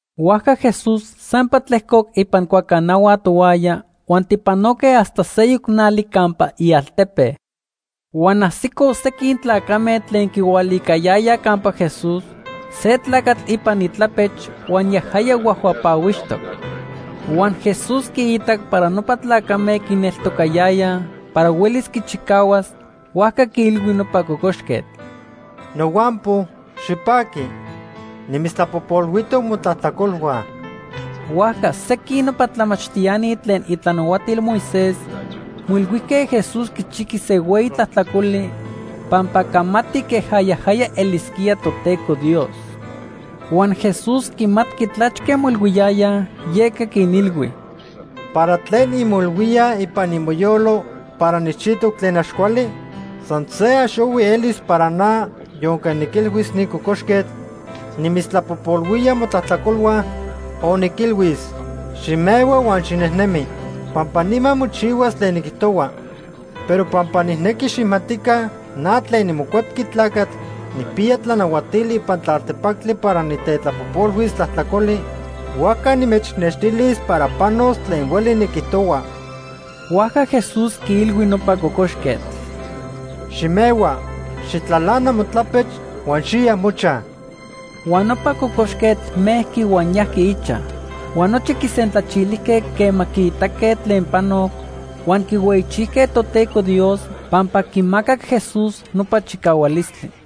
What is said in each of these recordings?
Huajca Jesús sampa tlejcoc ipan cuacanahua tohuaya huan tipanoque hasta seyoc nali campa ialtepe. Huan ajsicoj sequin tlacame tlen quihualicayayaj campa Jesús se tlacatl ipan itlapech huan yajaya huajhuapahuixtoc. Huan Jesús quiitac para nopa tlacame quineltocayayaj para huelis quichicahuas, huajca quiilhui nopa cocoxquetl: ―Nohuampo, xipaqui. Nimitztlapojpolhuijtoc motlajtlacolhua. Huajca sequin nopa tlamachtiani tlen itlanahuatil Moisés moilhuijque Jesús quichijqui se hueyi tlajtlacoli pampa camati queja yajaya elisquía Toteco Dios. Huan Jesús quimatqui tlachque moilhuiyayaj, yeca quinilhui: ―¿Para tlen inmoilhuíaj ipan imoyolo para nijchijtoc tlen ax cuali? San se ax ohui elis para na, yonque niquilhuis ni cocoxquetl: ‘Nimitztlapojpolhuía motlajtlacolhua’, o niquilhuis: ‘Ximehua huan xinejnemi’, pampa nima mochihuas tlen niquijtohua. Pero pampa nijnequi xijmatica na tlen niMocuepqui Tlacatl nijpiya tlanahuatili ipan tlaltepactli para nitetlapojpolhuis tlajtlacoli, huajca nimechnextilis para panos tlen hueli niquijtohua. Huajca Jesús quiilhui nopa cocoxquetl: ―Ximehua, xijtlalana motlapech huan xiya mochaj. Huan nopa cocoxquetl mejqui huan yajqui ichaj. Huan nochi quisentlachilijque quema quiitaque tlen panoc, huan quihueyichijque Toteco Dios pampa quimacac Jesús nopa chicahualistli.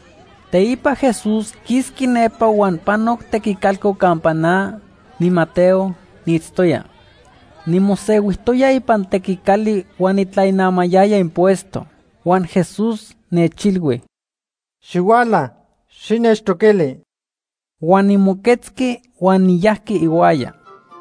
Teipa Jesús quisqui nepa huan panoc tequicalco campa na, niMateo, niitztoya. Nimosehuijtoya ipan tequicali huan nitlainamayaya impuesto. Huan Jesús nechilhui: ―Xihuala, xinechtoquili. Huan nimoquetzqui huan niyajqui ihuaya.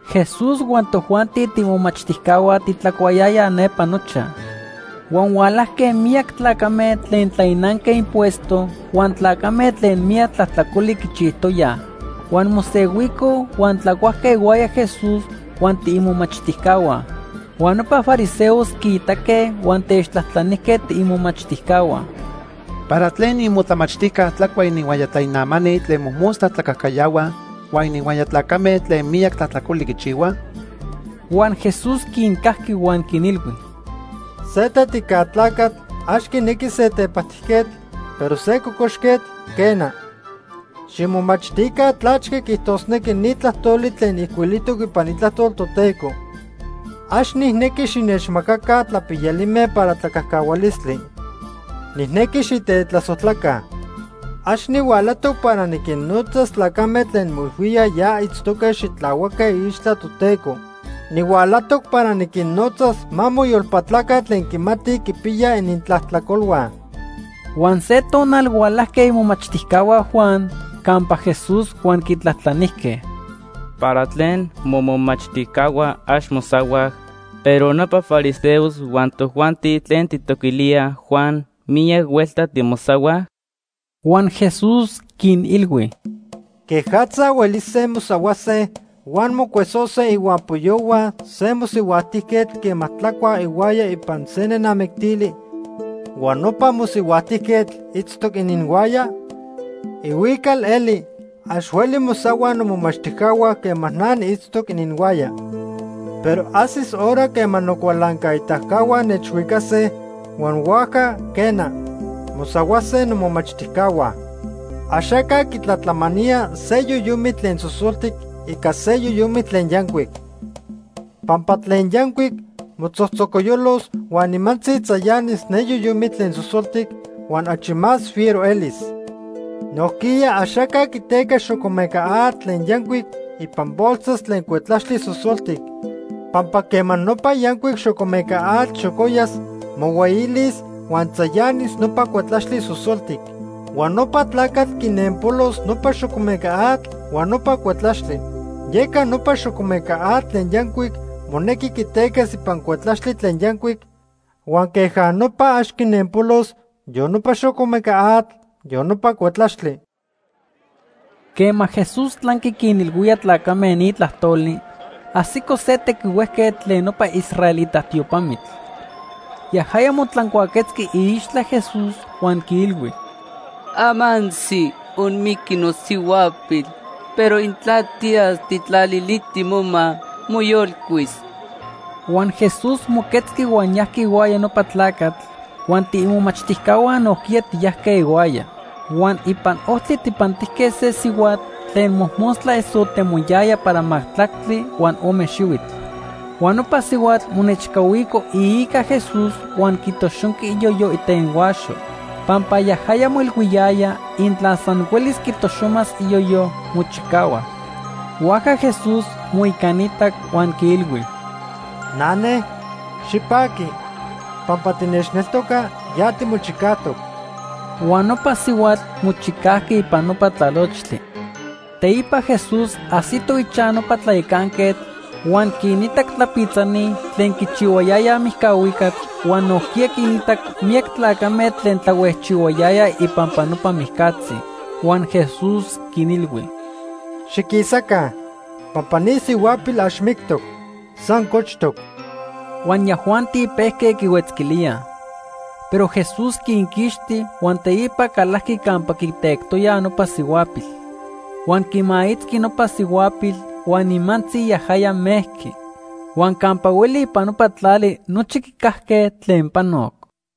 Jesús huan tojuanti tiimomachtijcahua titlacuayayaj nepa nochaj. Huan hualajque miyac tlacame tlen tlainanque impuesto huan tlacame tlen miyac tlajtlacoli quichijtoyaj. Huan mosehuicoj huan tlacuajque ihuaya Jesús huan tiimomachtijcahua. Huan nopa fariseos quiitaque huan techtlajtlanijque tiimomachtijcahua: ―¿Para tlen imotlamachtijca tlacua ininhuaya tlainamani tlen mojmostla tlacajcayahuaj huan ininhuaya tlacame tlen miyac tlajtlacoli quichihuaj? Huan Jesús quincajqui huan quinilhui: ―Se tetica tlacatl ax quinequi se tepajtijquetl, pero se cocoxquetl, quena. Ximomachtica tlachque quiijtosnequi ni tlajtoli tlen ijcuilijtoc ipan Itlajtol Toteco: ‘Ax nijnequi xinechmacaca tlapiyalime para tlacajcahualistli. Nijnequi xitetlasojtlaca.’ Ax nihualajtoc para niquinnotzas tlacame tlen moilhuíaj ya itztoque xitlahuaque iixtla Toteco. Nihualajtoc para niquinnotzas ma moyolpatlaca tlen quimatij quipiyaj inintlajtlacolhua. Huan se tonal hualajque imomachtijcahua Juan campa Jesús huan quitlajtlanijque: ―¿Para tlen momomachtijcahua ax mosahuaj, pero nopa fariseos huan tojuanti tlen tijtoquilíaj Juan miyac huelta timosahuaj? Huan Jesús quinilhui: ―¿Quejatza huelise mosahuase huan mocuesose ihuampoyohua se mosihuajtijquetl quema tlacuaj ihuaya ipan se nenamictili huan nopa mosihuajtijquetl itztoc ininhuaya? Ihuical eli ax hueli mosahuaj nomomachtijcahua quema na niitztoc ininhuaya. Pero ajsis hora quema nocualancaitacahua nechhuicase, huan huajca, quena, mosahuase nomomachtijcahua. “Axaca quitlatlamanía se yoyomitl tlen sosoltic ica se yoyomitl tlen yancuic. Pampa tlen yancuic motzojtzocoyolos huan nimantzi tzayanis ne yoyomitl tlen sosoltic huan achi más fiero elis. Nojquiya axaca quiteca xocomeca atl tlen yancuic ipan bolsas tlen cuetlaxtli sosoltic, pampa quema nopa yancuic xocomeca atl xocoyas, mohueyilis, huan tzayanis nopa cuetlaxtli sosoltic. Huan nopa tlacatl quinenpolos nopa xocomeca atl huan nopa cuetlaxtli. Yeca nopa xocomeca atl tlen yancuic monequi quitecas ipan cuetlaxtli tlen yancuic huan queja nopa ax quinenpolos yon nopa xocomeca atl, yon nopa cuetlaxtli.” Quema Jesús tlanqui quinilhuía tlacame ni tlajtoli, ajsico se tequihuejquetl tlen nopa israelita tiopamitl. Yajaya motlancuaquetzqui iixtla Jesús huan quiilhui: ―Amantzi onmijqui nosihuapil, pero intla tiyas tijtlaliliti moma, moyolcuis. Huan Jesús moquetzqui huan yajqui ihuaya nopa tlacatl, huan tiimomachtijcahua nojquiya tiyajque ihuaya. Huan ipan ojtli tijpantijque se sihuatl tlen mojmostla esotemoyaya para majtlactli huan ome xihuitl. Huan nopa sihuatl monechcahuico iica Jesús huan quitoxonqui iyoyo itenhuaxo. Pampa yajaya moilhuiyaya intla san huelis quitoxomas iyoyo, mochicahuas. Huajca Jesús moicanitac huan quiilhui: ―Nane, xipaqui. Pampa tinechneltoca, ya timochicajtoc. Huan nopa sihuatl mochicajqui ipan nopa tlalochtli. Teipa Jesús ajsito ichaj nopa tlayacanquetl huan quinitac tlapitzani tlen quichihuayayaj mijcahuicatl huan nojquiya quinitac miyac tlacame tlen tlahuejchihuayayaj ipampa nopa mijcatzi. Huan Jesús quinilhui: ―Xiquisaca, pampa ni sihuapil ax mictoc, san cochtoc. Huan yajuanti pejque quihuetzquilíaj. Pero Jesús quinquixti huan teipa calajqui campa quitectoyaj nopa sihuapil. Huan quimaitzqui nopa sihuapil huan nimantzi yajaya mejqui. Huan campa hueli ipan nopa tlali nochi quicajque tlen panoc.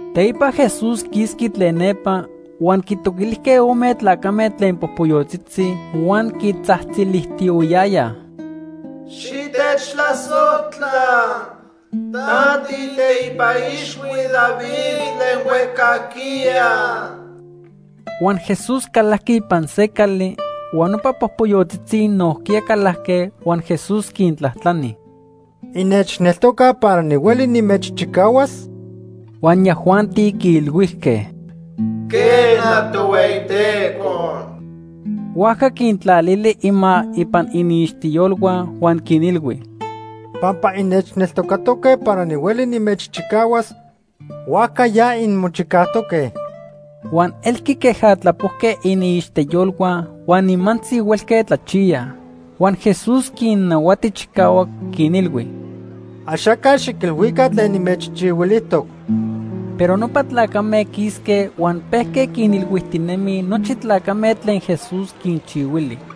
Teipa Jesús quisqui tlen nepa huan quitoquilijque ome tlacame tlen popoyotzitzi huan quitzajtzilijtiyohuiyayaj: ―Xitechtlasojtla, ta tiiteipa ixhui David tlen huejcajquiya. Huan Jesús calajqui ipan se cali, huan nopa popoyotzitzi nojquiya calajque huan Jesús quintlajtlani: ―¿Innechneltocaj para nihueli nimechchicahuas? Huan yajuanti quiilhuijque: ―Quena, Tohueyiteco. Huajca quintlalili ima ipan iniixtiyolhua huan quinilhui: ―Pampa innechneltocatoque para nihueli nimechchicahuas, huajca ya inmochicajtoque. Huan elqui queja tlapojque iniixtiyolhua huan nimantzi huelque tlachiyaj. Huan Jesús quinnahuati chicahuac, quinilhui: ―Axaca xiquilhuica tlen nimechchihuilijtoc. Pero nopa tlacame quisque huan pejque quinilhuijtinemij nochi tlacame tlen Jesús quinchihuili.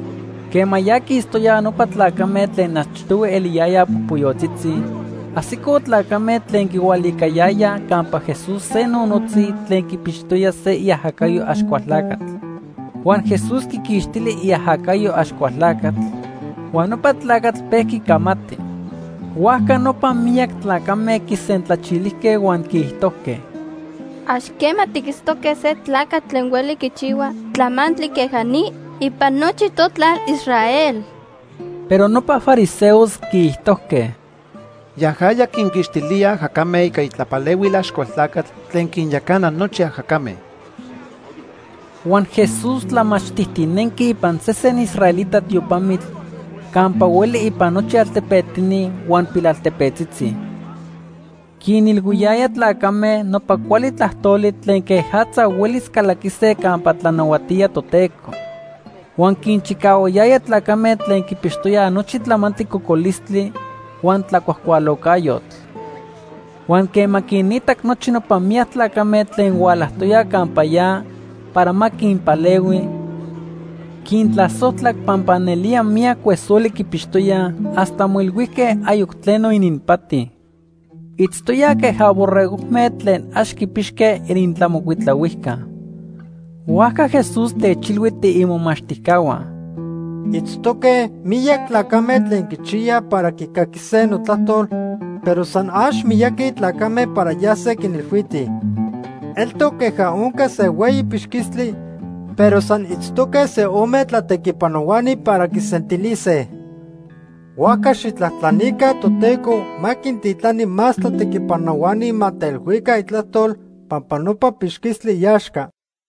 Quema ya quistoyaj nopa tlacame tlen achtohui eliyayaj popoyotzitzi, ajsicoj tlacame tlen quihualicayayaj campa Jesús se nonotzi tlen quipixtoya se iajacayo Axcualtlacatl. Huan Jesús quiquixtili iajacayo Axcualtlacatl, huan nopa tlacatl pejqui camati. Huajca nopa miyac tlacame quisentlachilijque huan quiijtojque: ―Ax quema tiquitztoque se tlacatl tlen hueli quichihua tlamantli queja ni ipan nochi totlal Israel. Pero nopa fariseos quiijtojque: ―Yajaya quinquixtilía ajacame ica itlapalehuil Axcualtlacatl tlen quinyacana nochi ajacame. Huan Jesús tlamachtitinenqui ipan sesen israelita tiopamitl campa hueli ipan nochi altepetini huan pilaltepetzitzi. Quinilhuiyaya tlacame nopa cuali tlajtoli tlen quejatza huelis calaquise campa tlanahuatía Toteco. Huan quinchicahuayaya tlacame tlen quipixtoyaj nochi tlamantli cocolistli huan tlacuajcualocayotl. Huan quema quinitac nochi nopa miyac tlacame tlen hualajtoyaj campa ya para ma quinpalehui, quintlasojtlac pampa nelía miyac cuesoli quipixtoyaj hasta moilhuijque ayoc tleno ininpati. Itztoyaj queja borregojme tlen ax quipixque inintlamocuitlahuijca. Huajca Jesús techilhui tiimomachtijcahua: ―Itztoque miyac tlacame tlen quichiyaj para quicaquise notlajtol, pero san ax miyaqui tlacame para yase quinilhuitij. Eltoc queja onca se hueyi pixquistli pero san itztoque se ome tlatequipanohuani para quisentilise. Huajca xijtlajtlanica Toteco ma quintitlani más tlatequipanohuani ma teilhuica itlajtol pampa nopa pixquistli iaxca.